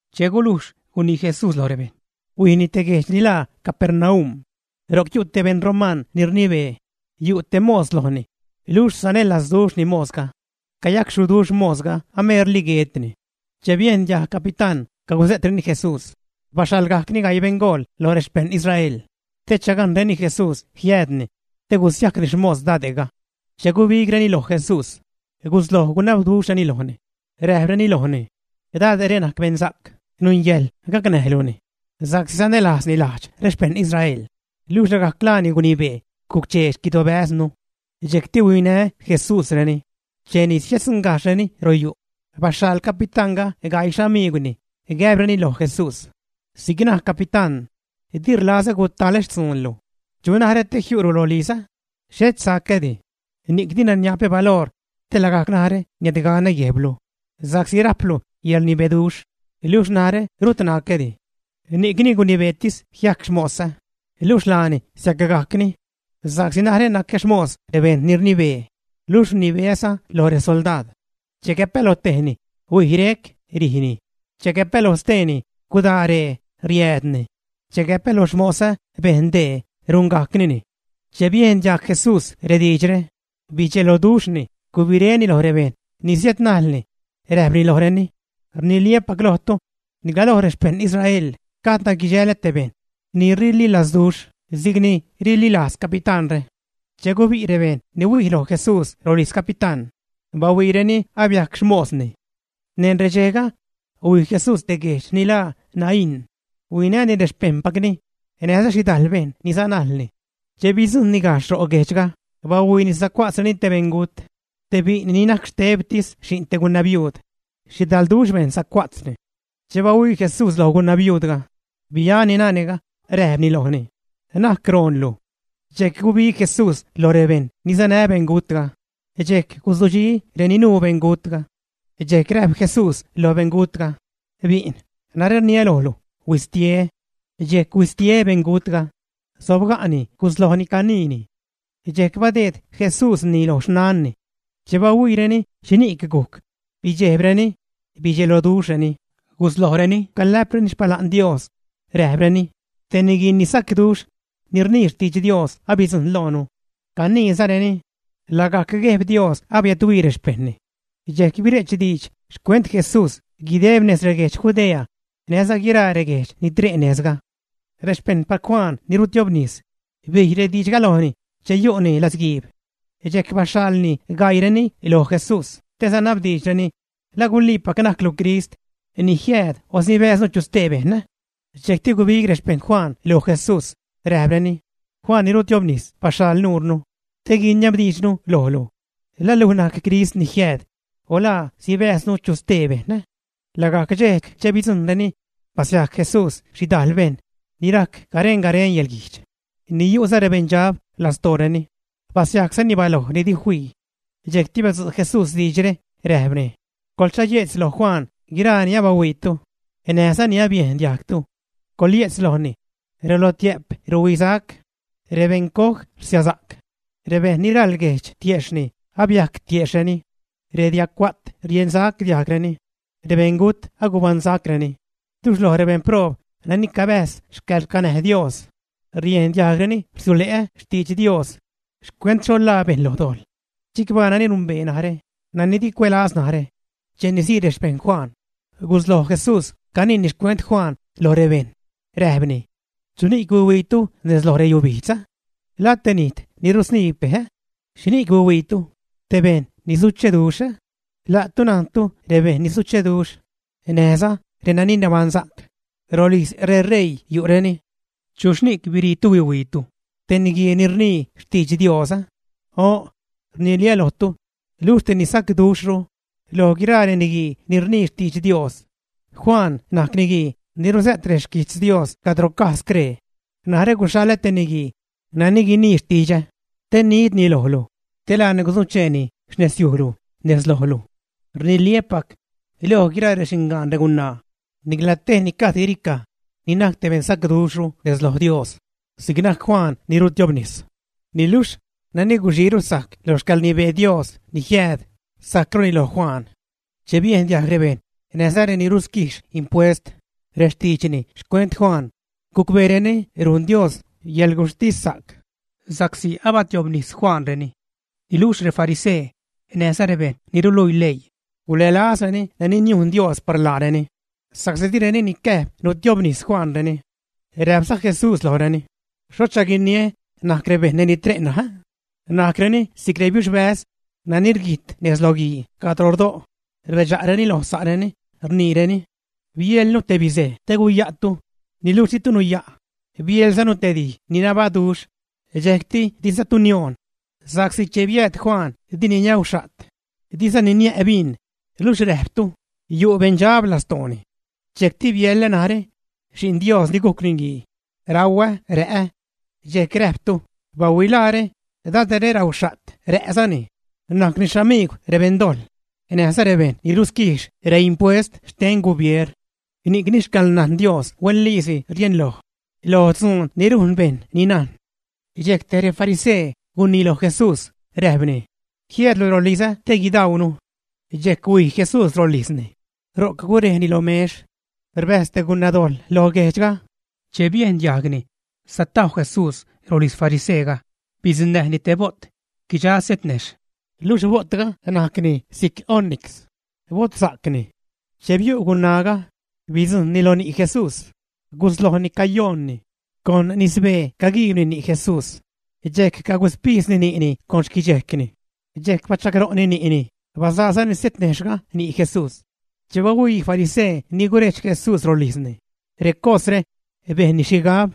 Che gulujx gunii Jesús loj rebejṉ, huijni te guejdx ni laa Capernaum. Ro'c yu' te beṉ romaṉ ni rnibee, yu' te mos lojni, luxh sanälazduxhni mosga. Cayacxhuduxh mosga, ameerli guetni. Che biejn diajg capitán cagusä'treni Jesús, baxhaḻgajcni gaii beṉgool lo rexpejṉ Israel te chagajnreni Jesús jiäädni te gusiajcni xmos dade'ga. Che gubigreni loj Jesús, gusloj gunabduxhreni lojni, räjpreni lojni: ―Dade're najc beṉsa'c, nungäjḻ gacnäjluni sa'csi sanälajzni lajdx rexpejṉ Israel, luxh lagajc laani gunibee guc-chee xquidobäznu. Dxejcti huinä Jesúsreni. Cheni siäddzuṉgajxhreni royu', baxhaḻ capitánga gaii xamiigwni, gäbreni loj Jesús: ―Si'c naj capitán: “Di rlazä gutalä xtzuunlu. ¿Chu narä te jiu'lu rolizä? Xhet sacädi. Ni'c dina niapä baloor te lagajc narä niädganä guejblu, sa'csi rajplu yäḻrnibeduxh niluxh narä rut nacädi. Ni'cni gunibeetis jiajc xmosä, luxh laani siacgajcni. Sa'csi narä nacä xmos rebejṉ ni rnibee, luxh rnibeäza loj resoldaad. Che gäpä lo tejni: Huij rec, rijni; che gäpä loj steeni: Gudaa ree, riäädni; che gäpä loj xmosä: Bejn dee, rungajcnini.” Che biejn diajg Jesús rediidxre, bidxeloduxhni, gubiréni loj rebejṉ ni siädnajlni, räjpni lojreni: ―Rniliä́pac lojtu, nicla lo rexpejṉ Israel gajdna guidxälä te bejṉ ni rililajzduxh si'c ni rililajz capitánre. Che gubi' rebejṉ ni huij loj Jesús rolijz capitán, bahuiireni abiajc xmosni. Neṉ redxejga, huij Jesús te guejdx ni laa Naín. Huinäni rexpejṉpacni näjza xhidajl bejṉ ni sanajlni. Che bidzujṉni gajxh ro' guejdxga, bahuiini sacua'tzreni te beṉgut, te bi'n ni najc xtebtis xi'n te gunabiuud. Xhidalduxh bejṉ sacua'tzni. Che bahuii Jesús loj gunabiuudga, biani nane'ga, räjpni lojni: ―¡Na'c roonlu! Dxejc gubig Jesús lo rebejṉ ni sanä beṉgutga, dxejc guzudxi reni nuu beṉgutga. Dxejc räjp Jesús loj beṉgutga: ―¡Bi'n!, narä rniä lojlu; ¡Huistie! Dxejc huistie beṉgutga, sobga'ni guslojni caniini. Dxejc badeed Jesúsni lo xnanni. Che bahuiireni xhini'c gujc, bidxejbreni, bidxeloduxhreni, guslojreni calä'preni xpala'n Dios, räjpreni: ―Te niguisacduxh ni rnii xtidx Dios abidzujṉ nez loonu. Caniizareni: ―Lagajc Guejb Dios abiädhuii rexpejṉni. Dxejc bire'ch diidx xcuent Jesús guideb nez reguedx Judea näjza guiraa reguejdx ni tre' nejzga. Rexpejṉpac Juan ni rutiobnis bij rediidxga lojni che yu'ni latzguiib. Dxejc baxhaḻni gaiireni lo Jesús te sanabdiidxreni: “¿La guliipac najclu Crist ni jiääd o sibäjznu chu stee bejṉ, ä?” Dxejcti gubig rexpejṉ Juan loj Jesús, räjpreni: ―Juan ni rutiobnis baxhaḻ nuurnu te guiniabdiidxnu lojlu: “¿La luj najc Crist ni jiääd o la sibäjznu chu stee bejṉ?” Lagajc dxejc che bidzujṉreni, basiajc Jesús xhidajl bejṉ ni rajc garen-garen yäḻguijdx, ni yu'za rebeṉdxab lastooreni, basiajczani baloj ni di fii. Dxejcti badzu' Jesús diidxre, räjpni: ―Coḻchaye'tz lo Juan guiraa ni abahuiitu näjza ni abiejn diajgtu. Coḻye'tz lojni: “Relotiä'p ruhuisac; rebeṉcoj rsiasa'c; rebeṉ ni raḻ guejdx tiejxhni, abiajc tiejxhni; rediagcua't riensac diajgreni; rebeṉgut, agubaṉsacreni; luxh loj rebeṉproob nani cabäjz xcäḻracnäj Dios riejn diajgreni rsiule' xtidx Dios xcuent xho ḻaa bejṉ lo dojḻ. Chicbaa nani rumbee narä, nani di cuälaz narä.” Cheni sii rexpejṉ Juan, gusloj Jesús caniini xcuent Juan loj rebejṉ, räjpni: ―¿Chuni'c huihuiitu nez lo reyubijdz? ¿La te nijt ni rusniib bej, ä? ¿Xhini'c huihuiitu? ¿Te bejṉ ni sucheduxh, ä? La'tu najntu rebejṉ ni sucheduxh näjza reni nabaṉsa'c, rolijz reṟeii yu'reni. ¿Chuxhni'c biriitu huihuiitu? ¿Te niguii ni rnii xtidx Dios, ä? O'n, rniliä́ lojtu, luxh te ni sacduxhru loj guiraa reniguii ni rnii xtidx Dios. Juan najc niguii ni ruzä't rexquijtz Dios cadro caj scree: Narä guxhaḻä te niguii nani guinii xtidxä, te nidni lojlu, te laani guzucheeni xnezyujlu nez lojlu. Rniliä́pac, loj guiraa rexingaan regunaa, nicla tejni gajd guiricaj ni najc te beṉsacduxhru nez loj Dios si'c najc Juan ni rutiobnis. Niluxh nani guxiiru sajc lo xcäḻrnibee Dios ni jiääd, sajcruni loj Juan. Che biejn diajg rebejṉ näjza reni rusquijx impuest rextiidxni xcuent Juan, gucbeereni rujn Dios yäḻguxhtissa'c, sa'csi abatiobnis Juanreni. Niluxh refarisee näjza rebejṉ ni ruluii leii gulälazreni nani niujn Dios par laareni, sa'csi direni nicäjb nutiobnis Juanreni. Räjpza Jesús lojreni: ―¿Xhocha guiniä najc rebejṉ nani tre' ṉaj? Najcreni si'c rebiuxbäz nani rguijt nez lo guii cadro rdo', rbedxa'reni loj sa'reni, rniireni: “Bieḻnu te bizej te guya'tu, niluxh ditu nuya'. Bieḻzanu te dij ni nabaduxh dxejcti dizatu nioon.” Sa'csi che biääd Juan, dini niauxha't, dizani niä' bin, luxh räjptu: “Yu' beṉdxab lastooni.” Dxejcti biäḻä narä, Xi'n Dios ni gujc Niguii, rauä, rä'ä. Dxejc räjptu: “Bahuilaare, dade're rauxha't, rä'zani, najcni xamiigw rebeṉdojḻ näjza rebejṉ ni rusquijx reimpuest xten gubier.” Ni'cni xcäḻnajn Dios huenliisi rieṉloj loj dzuun ni rujn rebejṉ ni najn. Dxejc tej refarisee gunii loj Jesús, räjpni: ―Jiäädlu rolizä te guidaunu. Dxejc huij Jesús rolijzni, ro'c gurejni lo mex. Rbäjz te gunagubejxh lo guejdxga. Che biejn diajgni satajw Jesús rolijz fariseega, bidzuṉnäjni te bo't guidxa se't nejxh, luxh bo'tga najc si'c onix, botsa'cni. Che biu' gunaaga, bidzujṉni lo ni' Jesús, guslojni cayoonni. Con nisbee caguiibni ni' Jesús, dxejc caguspijdzni ni'ni con xquidxejcni. Dxejc bachagro'ni ni'ni bazaazani setnejxhga ni' Jesús. Che bahuii farisee ni gurejdx Jesús rolijzni, recosre, bejnni xhigab: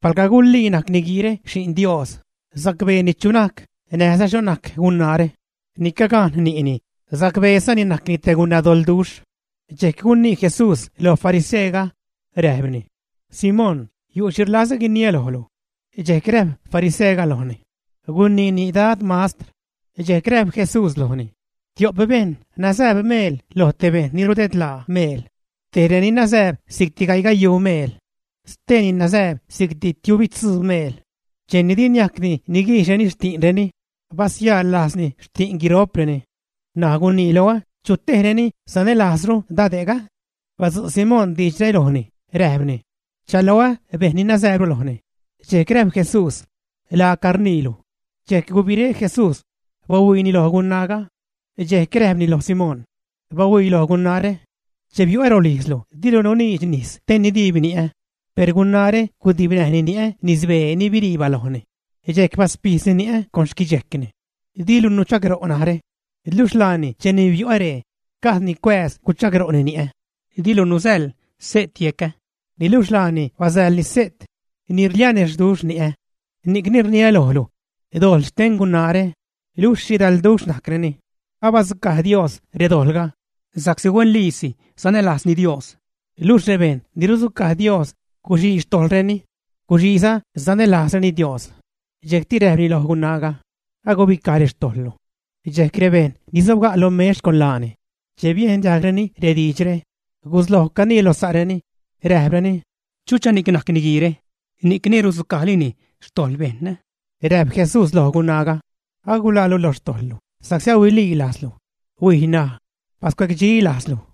“Palga gulii najc niguiire Xi'n Dios, sacbeeni chu najc näjza xho najc gunaare ni cagajn ni'ni, sacbeezani najcni te gunadoḻduxh.” Dxejc gunii Jesús loj fariseega, räjpni: ―Simón, yu' xhi rlazä guiniä lojlu. Dxejc räjp fariseega lojni: ―Guniini, Dad mastr. Dxejc räjp Jesús lojni: ―Tio'p bejṉ nazääb meel lo te bejṉ ni rudedlaa meel. Tej reni nazääb si'cti gaiigayuu meel. Steeni nazääb si'cti tiubitzuu meel. Cheni di niajcdi niguijxreni xti'nreni, basiäḻ lajzni xti'n guiro'preni. N̲aj gunii loä, ¿chu tejreni sianälajzru dade'ga, ä? Badzu' Simón diidxre lojni, räjpni: ―Rchaloä bejṉ ni nazääbru lojni. Dxejc räjp Jesús: ―Laaca rniilu. Dxejc gubiré Jesús, bahuiini loj gunaaga. Dxejc räjpni loj Simón: ―¡Bahuii loj gunaare! Che biu'ä rolijzlu, dilu nuniidx nis te nidiib ni'ä. Per gunaare gudibnäjni ni'ä nisbee ni birii balojni, dxejc baspijdzni ni'ä con xquidxejcni. Dilu nuchagro' narä, luxh laani cheli biu'ä ree, gajdni cuääz guchagro'ni ni'ä. Dilu nusäḻ se't yecä, niluxh laani basäḻni se't ni rlianexhduxh ni'ä. Ni'cni rniä lojlu, dojḻ xten gunaare, luxh xhidalduxh najcreni, abadzucaj Dios redojḻga sa'csi huenliisi sanälajzni Dios. Luxh rebejṉ ni rudzucaj Dios guxii xtojḻreni, guxiiza sanälajzreni Dios. Dxejcti räjpni loj gunaaga: ―Agubicaj rextojḻlu. Dxejc rebejṉ ni sobga' lo mex con laani, che biejn diajgreni rediidxre, gusloj canii lo sa'reni, räjpreni: ―¿Chuchani'c najc niguiire, ni'cni rudzucajlini xtojḻ bejṉ, ä? Räjp Jesús loj gunaaga: ―Aguḻaalu lo xtojḻlu sa'csi ahuililajzlu; huij ṉaj, bascuedxi lajzlu.